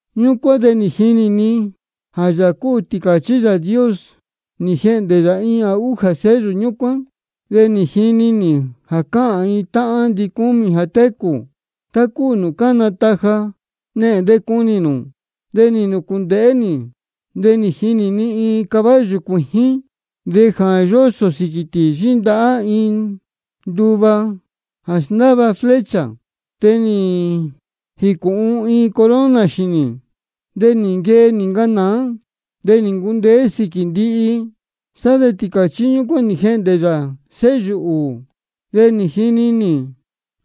Ñúcuán de nī jinī ni jā Yāā cúu Tīcāchí Yāā Dios, nī jehndē yā iin jā újā sello ñúcuán. De nī jini nī jā cáhān iin táhán ndicúmī jā técū, tá cúu nūū cána taja: Nehēn de cunī nū. De nī nūcūndēhé nī, de nī jinī ni iin caballo cuījín. De jā yósō sīquī tī yíndahá iin nduva jā sndáva flecha. De nī jīcūhun iin corona xīnī. De nī nquee nī ncanāá, de nī ncundeé sīquī ndihi. Sá de Tīcāchí ñúcuán nī jehndē yā sello ūū. De nī jini nī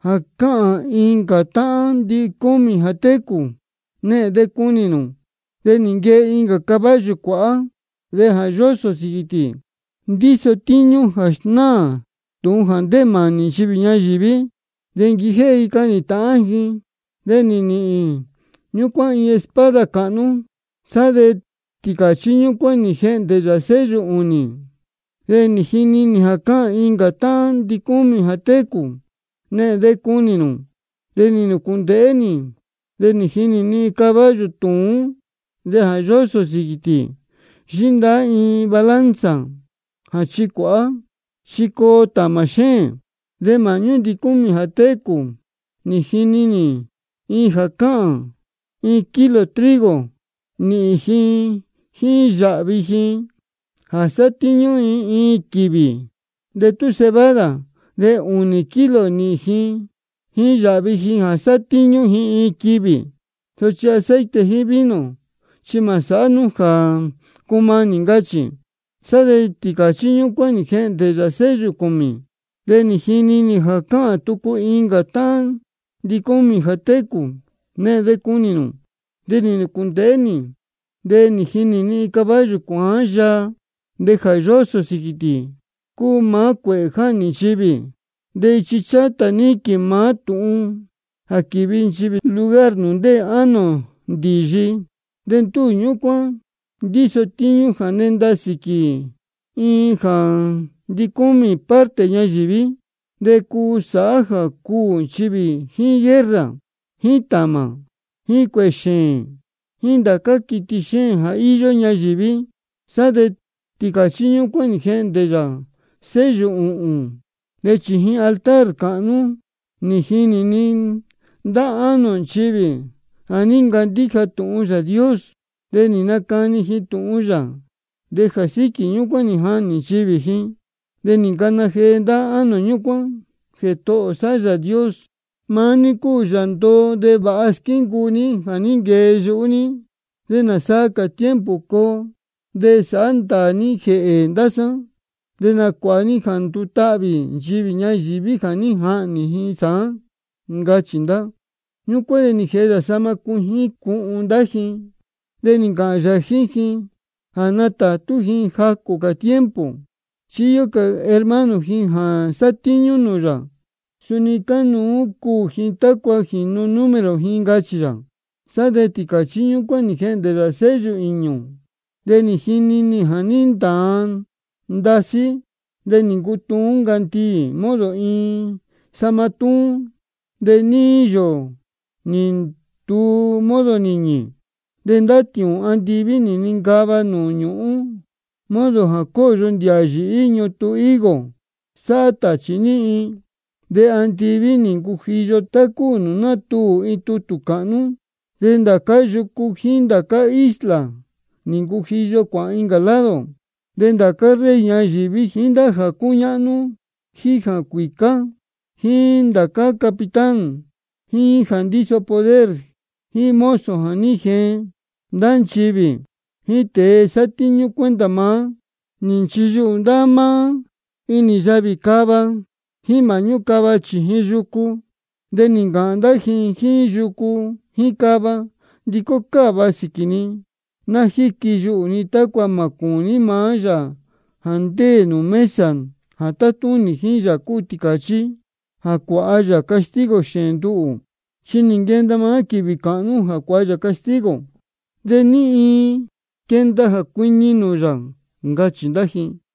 jā cáhān incā táhán ndicúmī jā técū: Nehēn de cunī nū. De nī nquee iin caballo cuāhá, de jā yósō sīquī tī ndíso tíñú jā snáā tūhun jā ndéē mānī nchivī ñayīví, de quijéhé ji cahnī tāhán ji. De nī nīhīn ñúcuán iin espada cāhnú. Sá de Tīcāchí ñúcuán nī jehndē yā sello ūnī. De nī jini nī jā cáhān incā táhán ndicúmī jā técū: Nehēn de cunī nū. De nī nūcūndēhé nī, de nī jinī ni iin caballo tūún. De jā yósō sīquī tī yíndahá iin balanza jā chícuāhá, chi coo tāmā xéēn. De māhñú ndicúmī jā técū nī jini nī iin jā cáhān: Iin kilo-ni trigo nīhīn ji jíín yāhvi ji jā sátíñú ji iin quīvī. De tú cebada de ūnī-ni kilo nīhīn ji jíín yāhvi ji jā sátíñú ji iin quīvī. Sochi aceite jíín vino chi mā sāhá nú jā cumanī, ncachī. Sá de Tīcāchí ñúcuán nī jehndē yā sello cūmī. De nī jini nī jā cáhān tucu incā táhán ndicúmī jā técū: Nehēn de cunī nū. De nī nūcūndēhé nī, de nī jinī ni iin caballo cuāán yaa, de jā yósō sīquī tī cúu maá cuēhē jáhnī nchivī. De ichi chátā níquīn maá tūhun jā quívi nchivī lugar nūū ndéē ánō ndīyi. De ndúū ñúcuán ndíso tíñú jā nenda sīquī iin jā ndicúmī parte ñayīví, de cuu sāhá jā cuū nchivī jíín guerra, jíín tāmā, jíín cuēhē xēēn, jíín ndācá quiti xéēn jā íyó ñayīví. Sá de Tīcāchí ñúcuán nī jehndē yā sello ūhūn. De chījin altar cāhnú nī jinī ni ndá ánō nchivī jā ní ncandíja tūhun Yāā Dios de nī nacani ji tūhun yā, de jā síquī ñúcuán nī jahnī nchivī ji. De nī ncana jee ndá ánō ñúcuán: Jētohō sá Yāā Dios, maá ní cúu Yāā ndoo de vāha squíncuu ní jā ní nquee yuhú ní. ¿De nāsaa cā tiempo coo de sāhá ndāā ní jēhē ndá sá, de nacuāha ní jā ndutahvī nchivī ñayīví jā ní jahnī sāán? ncachī ndá. Ñúcuán de nī jēhe yā sahma cuijín cuhun ndá ji, de nī ncāhān yā jíín ji jā ná nátātú ji jacū cā tiempo. Chi íyó cā hermano ji jā sátíñú nūū yā, jā suni cánuú cuū ji tácua jīnu número ji, ncachī yā. Sá de Tīcāchí ñúcuán nī jehndē yā sello īñū. De nī jinī ni jā ní ntāan ndasí. De nī ncutuún ncandiī modo iin sahma túún. De níí yōō nī nduu modo nīñī. De ndá tiūūn andiví nī nincava nūū ñūhún modo jā cóyo ndīhā yīhí ñutun higo sáhá tāchī níhin. De andiví nī ncujiyo tá cúu jā nátuū iin tutū cāhnú. De ndācá yucu jíín ndācá isla nī ncujiyo cuāhān incā lado. De ndācá rey ñayīví, jíín ndá jā cúñáhnú, jíín jā cuīcá, jíín ndācá capitán, jíín jā ndíso poder, jíín mozo jā ní jeen ndá nchivī, jíín tēe sátíñú cuenta maá, nī nchiyuhū ndá maá inī yavī cava jíín māhñú cava chījin yucu. De nī ncāhān ndá ji jíín yucu jíín cava: Ndicó cáva sīquī ni, ná quíyuhū ni tácua mā cūní maá Yāā jā ndéē nūū mesa jā tátúnī, jíín Yāā cúu Tīcāchí jā cuāha yā castigo xēēn nduhū. Chi nī nquenda maá quīvī cāhnú jā cuāha yā castigo, ¿de ní iin quenda jā cuiñi nūū yā? ncachī ndá ji.